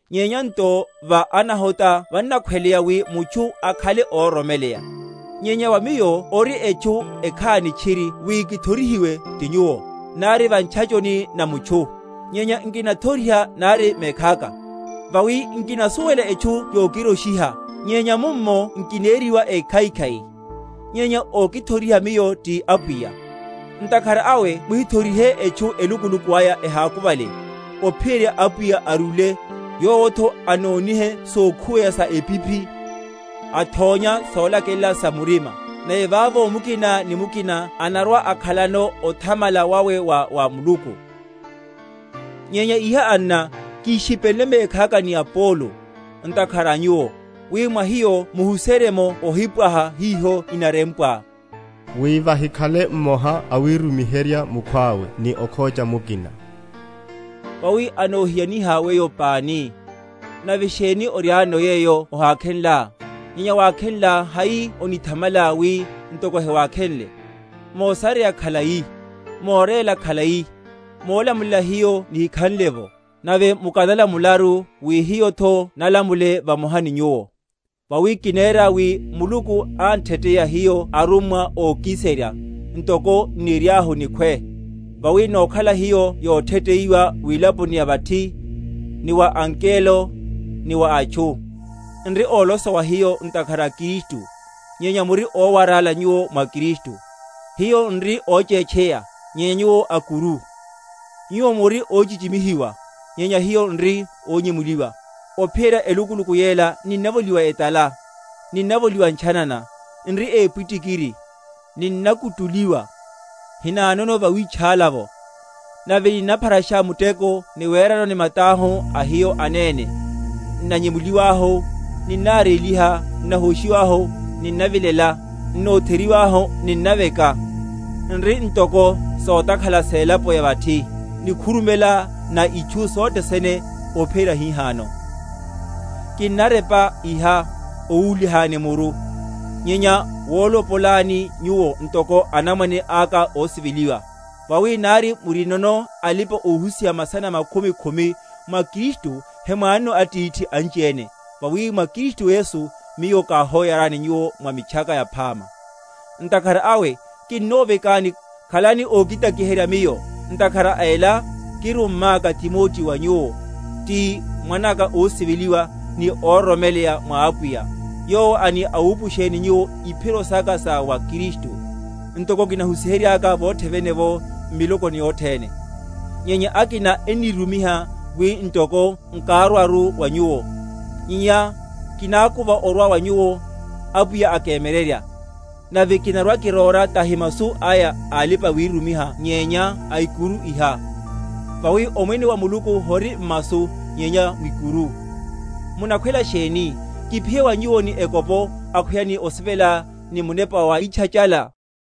Nyenya nto va anahota vannakhweleya, wi mutchu akhale óroromeleya. Nyenya wa miyo ori etchu ekhani tchiri wi kithorihiwe ti nyuwo, nari va ntchachoni na mutchu; nyenya nkinathoriha nari mekhaka. Vawi nkinasuwela etchu yokiroshiha; nyenya mummo nkineriwa ékhaikhai; nyenya ókithoriha miyo ti Apwiya. Ntakhara awe muhithorihe etchu elukuluku aya ehákuvale, ophiyerya Apwiya arúle, yowotho anonihe sokhuweya sa epiphi, athónya solakelela sa murima; nave vavo mukina ni mukina anarwa‐akhalano othamala wawe wa wa Muluku. Wirumiha wa aKorinto. Wíyeviha wa arummwa. Nyenya iha, anna, kíshipenle mekhaka ni Apolo, ntakhara a nyuwo, wi mwa hiyo muhuserye’mo ohipwaha hiho inarempwa; wi vahikhale mmoha awirumiherya mukhwawe ni okhocha mukina. Vawi anohiyaniha weyo pani? Nave sheni oriáno yeyo ohakhenlá? Nyenya wakhenlá hai onithamalá, wi ntoko hewákhenle? Mosareya khalai, moréla khalai, molamulela hiyo nihikhanle’vo; nave mukanalamularu, wi hiyotho nalamule vamoha ni nyuwo. Vawi kinera, wi Muluku ántheteya hiyo arummwa ókiserya, ntoko n’niriahu níkhwe; vawi nokhala hiyo yotheteiwa wilaponi ya vathi, ni wa angelo, ni wa atchu. N’ri ólosowa hiyo ntakhara a Kristu, nyenya muri ówarála nyuwo mwa Kristu; hiyo n’ri óchétcheya, nyenya nyuwo a’kuru; nyuwo muri óchichimihiwa, nyenya hiyo n’ri ónyemuliwa. Ophiyerya elukuluku yela ninnavoliwa etala, ninnavoliwa ntchanana, n’ri épwitikiri, ninnakutuliwa, hinanono vawítchála’vo; nave ninnapharasha muteko, ni werano ni matahu a hiyo anene; n’nanyemuliwahu ninnaréliha; n’nahóshiwahu ninnavilela; n’notheryiwahu, ninnaveka; n’ri ntoko sotakhala selapo ya vathi, nikhurumela na itchu sothe sene, ophiyerya hihano. Kinnarepa iha owúlihani muru, nyenya wolopolani nyuwo ntoko anamwane aka ósiveliwa. Vawi nari murinono alipa‐ohusiha masana makhumi khumi mwa Kristu, hemwanono atithi anchiene; vawi mwa Kristu Yesu miyo káhóyarani nyuwo mwa Mitchaka Yaphama. Ntakhara awe kinnovekani, khalani ókitakiherya miyo. Ntakhara a ela kirummáka Timoteo wa nyuwo, ti mwanaka ósiveliwa ni óroromeleya mwa Apwiya, yowo ani awupusheni nyuwo iphiro saka sa mwa Kristu, ntoko kinahusiher?-?yaka vothe vene’vo m’miloko yothene. Nyenya akina ennírumiha, wi ntoko nkárwaru wa nyuwo. Nyenya kinákuva orwa wa nyuwo, Apwiya akemyererya; nave kinarwa‐kiróra tahi masu aya a alipa‐wirumiha nyenya ikuru iha. Vawi omwene wa Muluku hori m’masu, nyenya mwikuru. Munakhwela sheni? Kiphiye wa nyuwo ni ekopo, akhweya ni osivela, ni munepa wawítchachala?